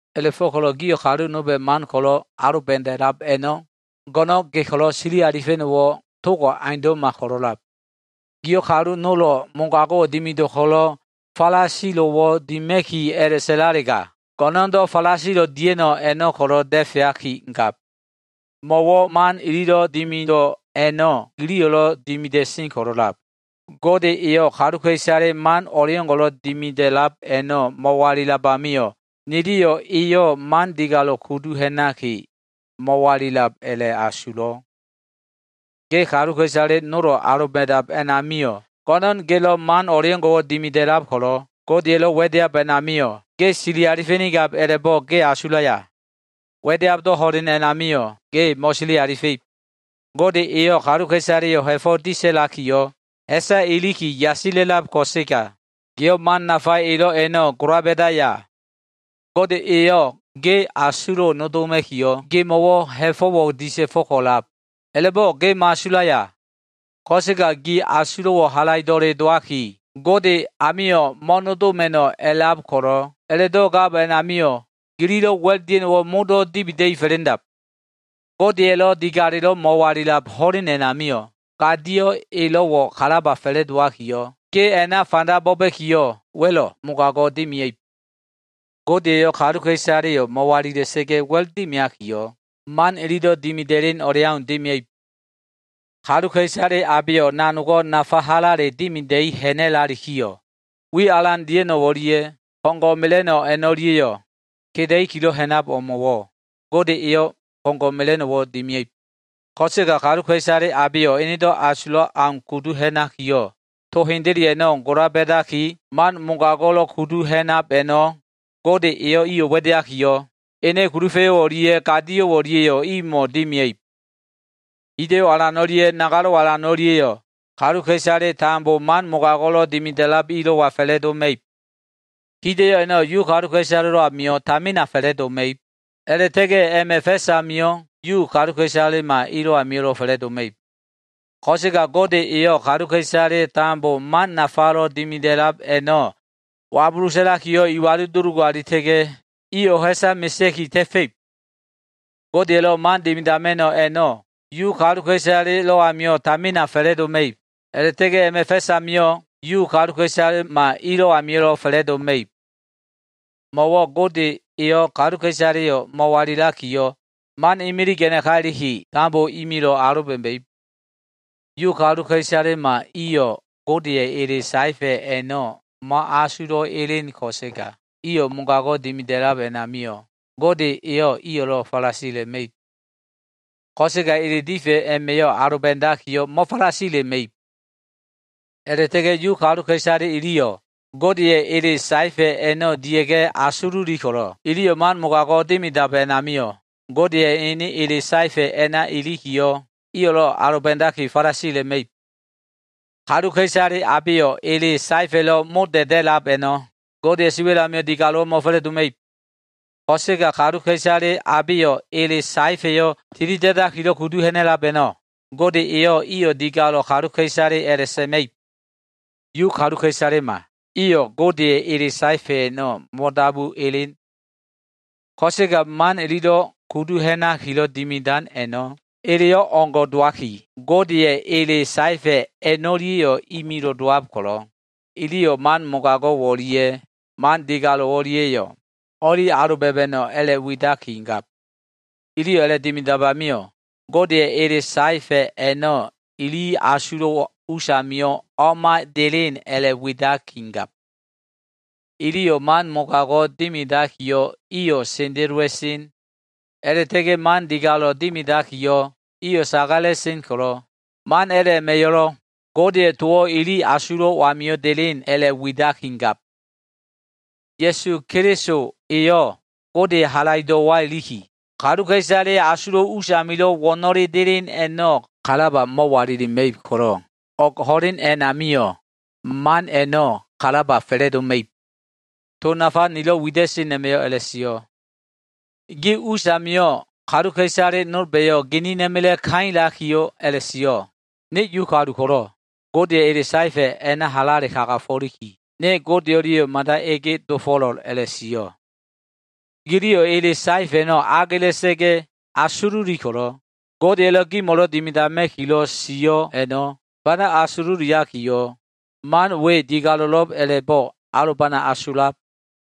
A꞉la꞉fo꞉ko꞉lo꞉ gio꞉ kalu nolba꞉ man ko꞉lo꞉ aloba꞉da꞉lab a꞉no꞉, go꞉no꞉n ge ko꞉lo꞉ a꞉sili alifa꞉no꞉wo꞉ togo꞉ aundo꞉ma ko꞉lo꞉lab. Gio꞉ kalu nolo꞉ mogago꞉ dimido꞉ ko꞉lo꞉ falasilo꞉wo꞉ dima꞉ki a꞉la꞉sa꞉lalega, go꞉no꞉ndo꞉ falasilo꞉ dia꞉no꞉ a꞉no꞉ ko꞉lo꞉ da꞉feaki gab. Mo꞉wo꞉ man ililo꞉ dimido꞉ a꞉no꞉ giliyo꞉lo꞉ dimida꞉sen ko꞉lo꞉lab. Gode eyo꞉ kaluka꞉isale man o꞉ngo꞉lo꞉ dimida꞉lab a꞉no꞉ mo꞉walilab amio꞉, niliyo꞉ eyo꞉ man digalo꞉ kudu ha꞉naki mo꞉walilab a꞉la꞉asulo꞉. Ge kaluka꞉isale nolo꞉ aloba꞉dab a꞉namio꞉, go꞉no꞉n gelo꞉ man o꞉leo꞉ngo꞉wo꞉ dimida꞉lab ko꞉lo꞉, Godeya꞉lo꞉ wa꞉deab a꞉namio꞉ ge sili alifa꞉nigab a꞉la꞉bo꞉ ge asulaya? Wa꞉deabdo꞉ ho꞉len a꞉namio꞉ ge mo꞉sili alifa꞉ib. Gode eyo꞉ kaluka꞉isaleyo꞉ ha꞉fo꞉ disa꞉lakiyo꞉, ha꞉sa iliki yasila꞉lab ko꞉sega, giyo꞉ man nafa elo꞉ a꞉no꞉ gola ba꞉daya? Gode eyo꞉ ge asulo꞉wo꞉ nodoma꞉kiyo꞉ gemo꞉wo꞉ ha꞉fo꞉wo꞉ disa꞉fo꞉ko꞉lab. A꞉la꞉bo꞉ ge mo꞉asulaya? Ko꞉sega gi asulo꞉wo꞉ halaido꞉le dowaki, Gode amio꞉ mo꞉nodoma꞉no꞉ a꞉lab ko꞉lo꞉, a꞉la꞉do꞉ gab a꞉namio꞉ gililo꞉ wa꞉l dia꞉no꞉wo꞉ modo꞉ dibida꞉i fa꞉la꞉ndab. Godeya꞉lo꞉ digalelo꞉ mo꞉walilab ho꞉len a꞉namio꞉, gadio꞉ elo꞉wo꞉ kalaba fa꞉la꞉dowakiyo꞉, ge a꞉na fanda bo꞉ba꞉kiyo꞉, wa꞉lo꞉ mogago꞉ dimia꞉ib. Gode eyo꞉ kaluka꞉isaleyo꞉ mo꞉walila꞉sa꞉ga꞉ wa꞉l dimiakiyo꞉, man inido꞉ dimida꞉len o꞉leau dimia꞉ib. Kaluka꞉isale abeyo꞉ nanogo꞉ nafa halale dimida꞉i ha꞉na꞉lalikiyo꞉, wi alan dia꞉no꞉ o꞉lia꞉ ko꞉ngo꞉ mela꞉no꞉ a꞉no꞉lia꞉yo꞉ keda꞉ikilo꞉ ha꞉nab o꞉mo꞉wo꞉, Gode eyo꞉ ko꞉ngo꞉ mela꞉no꞉wo꞉ dimia꞉ib. Ko꞉sega kaluka꞉isale abeyo꞉ enedo꞉ asulab au kudu ha꞉nakiyo꞉, to hendele a꞉no꞉ gola ba꞉daki, man mogago꞉lo꞉ kudu ha꞉nab a꞉no꞉, Gode eyo꞉ iyo꞉ wa꞉deakiyo꞉, ene kulufa꞉yo꞉ o꞉lia꞉ gadio꞉ o꞉lia꞉yo꞉ imo꞉ dimia꞉ib. Hida꞉yo꞉ alan o꞉lia꞉ nagalo꞉ alan o꞉lia꞉yo꞉ kaluka꞉isale tambo man mogago꞉lo꞉ dimida꞉lab ilo꞉wa fa꞉la꞉doma꞉ib. Hida꞉yo꞉ a꞉no꞉ Yu kaluka꞉isalelo꞉ amio꞉ tamina fa꞉la꞉doma꞉ib, a꞉la꞉ta꞉ga꞉ a꞉ma꞉ fa꞉s amio꞉ Yu kaluka꞉isalema ilo꞉ amio꞉lo꞉ fa꞉la꞉doma꞉ib. Ko꞉sega Gode eyo꞉ kaluka꞉isale tambo man nafalo꞉ dimida꞉lab a꞉no꞉ wabulu sa꞉lakiyo꞉ iwalu dulugu alita꞉ga꞉, iyo꞉ ha꞉sa mesea꞉ki ta꞉fa꞉ib. Godeya꞉lo꞉ man dimidama꞉no꞉ a꞉no꞉, Yu kaluka꞉isalelo꞉ amio꞉ tamina fa꞉la꞉doma꞉ib, a꞉la꞉ta꞉ga꞉ a꞉ma꞉ fa꞉s amio꞉ Yu kaluka꞉isalema ilo꞉ amio꞉lo꞉ fa꞉la꞉doma꞉ib. Mo꞉wo꞉ Gode eyo꞉ kaluka꞉isaleyo꞉ mo꞉walilakiyo꞉, man imilig a꞉naka iliki, tambo imilo꞉ aloba꞉ma꞉ib. Yu kaluka꞉isalema iyo꞉ Godeya꞉ ele saefa꞉ a꞉no꞉ mo꞉asulo꞉ elen ko꞉sega, iyo꞉ mogago꞉ dimidab a꞉namio꞉, Gode eyo꞉ iyo꞉lo꞉ falasila꞉ma꞉ib. Ko꞉sega ele difa꞉ a꞉ma꞉ aloba꞉dakiyo꞉ mo꞉falasila꞉ma꞉ib. A꞉la꞉ta꞉ga꞉ Yu kaluka꞉isale iliyo꞉ Godeya꞉ ele saefa꞉ a꞉no꞉ dia꞉ga꞉ asululi ko꞉lo꞉, iliyo꞉ man mogago꞉ dimidab a꞉namio꞉, Godeya꞉ ene ele saefa꞉ a꞉na ilikiyo꞉, iyo꞉lo꞉ aloba꞉daki falasila꞉ma꞉ib. Kaluka꞉isale abeyo꞉ ele saefa꞉lo꞉ mo da꞉da꞉lab a꞉no꞉, Godeya꞉ siwa꞉l amio꞉ digalo꞉wo꞉ mo꞉fa꞉la꞉doma꞉ib. Ko꞉sega kaluka꞉isale abeyo꞉ ele saefa꞉yo꞉ tilida꞉dakilo꞉ kudu ha꞉na꞉lab a꞉no꞉, Gode eyo꞉ iyo꞉ digalo꞉ kaluka꞉isale a꞉la꞉sa꞉ma꞉ib. Yu kaluka꞉isalema iyo꞉ Godeya꞉ ele saefa꞉ a꞉no꞉ mo꞉dabu elen. Ko꞉sega man ililo꞉ kudu ha꞉nakilo꞉ dimidan a꞉no꞉ eleyo꞉ o꞉ngo꞉ dowaki, Godeya꞉ ele saefa꞉ a꞉no꞉lia꞉yo꞉ imilo꞉ dowab ko꞉lo꞉, iliyo꞉ man mogago꞉ o꞉lia꞉ man digalo꞉ o꞉lia꞉yo꞉ o꞉li aloba꞉ma꞉no꞉ a꞉la꞉widakigab. Iliyo꞉ a꞉la꞉dimidab amio꞉, Godeya꞉ ele saefa꞉ a꞉no꞉ ili asulo꞉ usamio꞉ o꞉ma elen a꞉la꞉widakigab. Iliyo꞉ man mogago꞉ dimidakiyo꞉, iyo꞉ sendelowa꞉sen. A꞉la꞉ta꞉ga꞉ man digalo꞉ dimidakiyo꞉, iyo꞉ sagala꞉sen ko꞉lo꞉, man a꞉la꞉ a꞉ma꞉yo꞉lo꞉ Godeya꞉ towo꞉ ili asulo꞉ amio꞉ delen a꞉la꞉widakigab. Ya꞉su Keliso eyo꞉ Godeya꞉ halaido꞉wa iliki, kaluka꞉isaleya꞉ asulo꞉ usamilo꞉ wo꞉no꞉lelo꞉ delen a꞉no꞉ kalaba mo꞉walilima꞉ib ko꞉lo꞉, o꞉g ho꞉len a꞉namio꞉, man a꞉no꞉ kalaba fa꞉la꞉doma꞉ib. To nafa nilo꞉ wida꞉sen a꞉ma꞉yo꞉ a꞉la꞉sio꞉. Gi us amio꞉ kaluka꞉isale nolba꞉yo꞉ ginina꞉ma꞉la꞉ kailakiyo꞉ a꞉la꞉sio꞉, “Ne Yu kalu ko꞉lo꞉, Godeya꞉ ele saefa꞉ a꞉na halale kagafo꞉liki, ne Gode o꞉lia꞉ mada ege dofo꞉lo꞉l” a꞉la꞉sio꞉. Giliyo꞉ ele saefa꞉ a꞉no꞉ agela꞉sa꞉ga꞉ asululi ko꞉lo꞉, Godeya꞉lo꞉ gimo꞉lo꞉ dimidama꞉kilo꞉ sio꞉ a꞉no꞉ fanda asululiakiyo꞉, man we digalo꞉lo꞉b a꞉la꞉bo꞉ alobana asulab.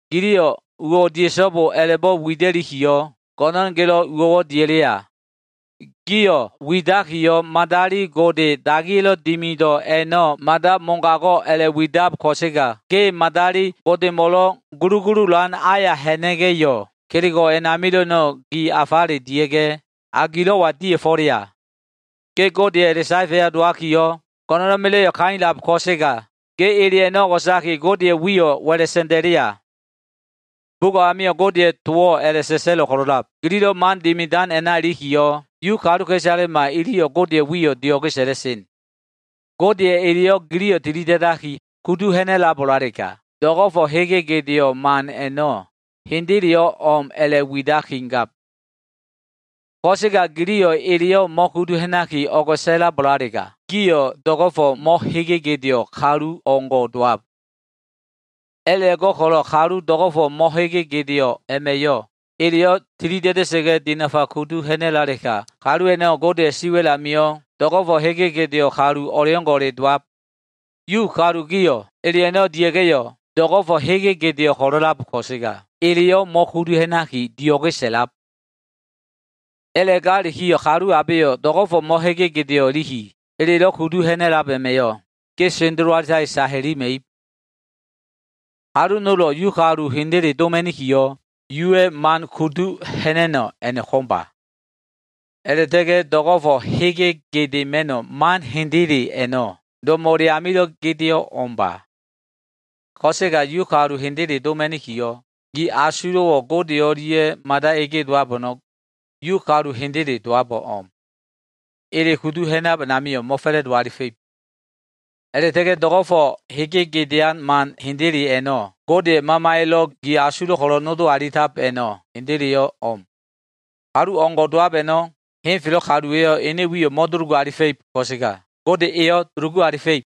Giliyo꞉ “uwo꞉ dia꞉so꞉bo” a꞉la꞉bo꞉ wida꞉likiyo꞉, go꞉no꞉n gelo꞉ uwo꞉ dia꞉leya? Giyo꞉ widakiyo꞉, madali gode dagiya꞉lo꞉ dimido꞉ a꞉no꞉ mada mogago꞉ a꞉la꞉widab, ko꞉sega ge madali godemo꞉lo꞉ gulugululan aya ha꞉na꞉ga꞉yo꞉, kelego꞉ a꞉namilo꞉ a꞉no꞉ gi afale dia꞉ga꞉ a gilo꞉wa dia꞉fo꞉leya? Ge Godeya꞉ ele saefa꞉ya dowakiyo꞉, go꞉no꞉na꞉ma꞉la꞉yo꞉ kailab ko꞉sega, ge ele a꞉no꞉ o꞉go꞉saki, Godeya꞉ wiyo꞉ wa꞉la sa꞉nda꞉leya? Bugo꞉ amio꞉ Godeya꞉ towo꞉ a꞉la꞉sa꞉sa꞉lo꞉ ko꞉lo꞉lab, “Gililo꞉ man dimidan a꞉na ilikiyo꞉, Yu kaluka꞉isalema iliyo꞉ Godeya꞉ wiyo꞉ dio꞉ge sa꞉la꞉sen.” Godeya꞉ eleyo꞉ gio꞉ tilida꞉daki kudu ha꞉na꞉labo꞉lalega, do꞉go꞉fo꞉ hege gedeo꞉ man a꞉no꞉ hendeleyo꞉ o꞉m a꞉la꞉widakigab. Ko꞉sega gio꞉ eleyo꞉ mo꞉kudu ha꞉naki o꞉go꞉sa꞉labo꞉lalega, gio꞉ do꞉go꞉fo꞉ mo꞉hege gedeo꞉ kalu o꞉ngo꞉ dowab. A꞉la꞉go꞉ko꞉lo꞉ kalu do꞉go꞉fo꞉ mo꞉hege gedeo꞉ a꞉ma꞉yo꞉ eleyo꞉ tilida꞉da꞉sa꞉ga꞉ dinafa kudu ha꞉na꞉lalega, kalu a꞉no꞉ Godeya꞉ siwa꞉l amio꞉ do꞉go꞉fo꞉ hege gedeo꞉ kalu o꞉leo꞉ngo꞉le dowab. Yu kalu gio꞉, ele a꞉no꞉ dia꞉ga꞉yo꞉, do꞉go꞉fo꞉ hege gedeo꞉ ko꞉lo꞉lab ko꞉sega, eleyo꞉ mo꞉kudu ha꞉naki dio꞉ge sa꞉lab. A꞉la꞉galikiyo꞉, kalu abeyo꞉ do꞉go꞉fo꞉ mo꞉hege gedeo꞉ iliki elelo꞉ kudu ha꞉na꞉lab a꞉ma꞉yo꞉, ge sendelo alitaki sa hilima꞉ib. Kalu nolo꞉ Yu kalu hendele doma꞉nikiyo꞉, Yuwa꞉ man kudu ha꞉na꞉no꞉ a꞉no꞉ ko꞉mba. A꞉la꞉ta꞉ga꞉ do꞉go꞉fo꞉ hege gedema꞉no꞉ man hendele a꞉no꞉, do꞉mo꞉le amilo꞉ gedeo꞉ o꞉mba. Ko꞉sega Yu kalu hendele doma꞉nikiyo꞉, gi asulo꞉wo꞉ Gode o꞉lia꞉ mada ege dowab a꞉no꞉, Yu kalu hendele dowabo꞉ o꞉m. Ele kudu ha꞉nab a꞉namio꞉ mo꞉fa꞉la꞉do alifa꞉ib. A꞉la꞉ta꞉ga꞉ do꞉go꞉fo꞉ hege gedean man hendele a꞉no꞉, Godeya꞉ Mamaya꞉lo꞉ gi asulo꞉ ko꞉lo꞉ nodo alita꞉lab a꞉no꞉ hendeleyo꞉ o꞉m. Kalu o꞉ngo꞉ dowab a꞉no꞉, henfelo꞉ kaluwa꞉yo꞉ ene wiyo꞉ mo꞉dulugu alifa꞉ib ko꞉sega, Gode eyo꞉ dulugu alifa꞉ib.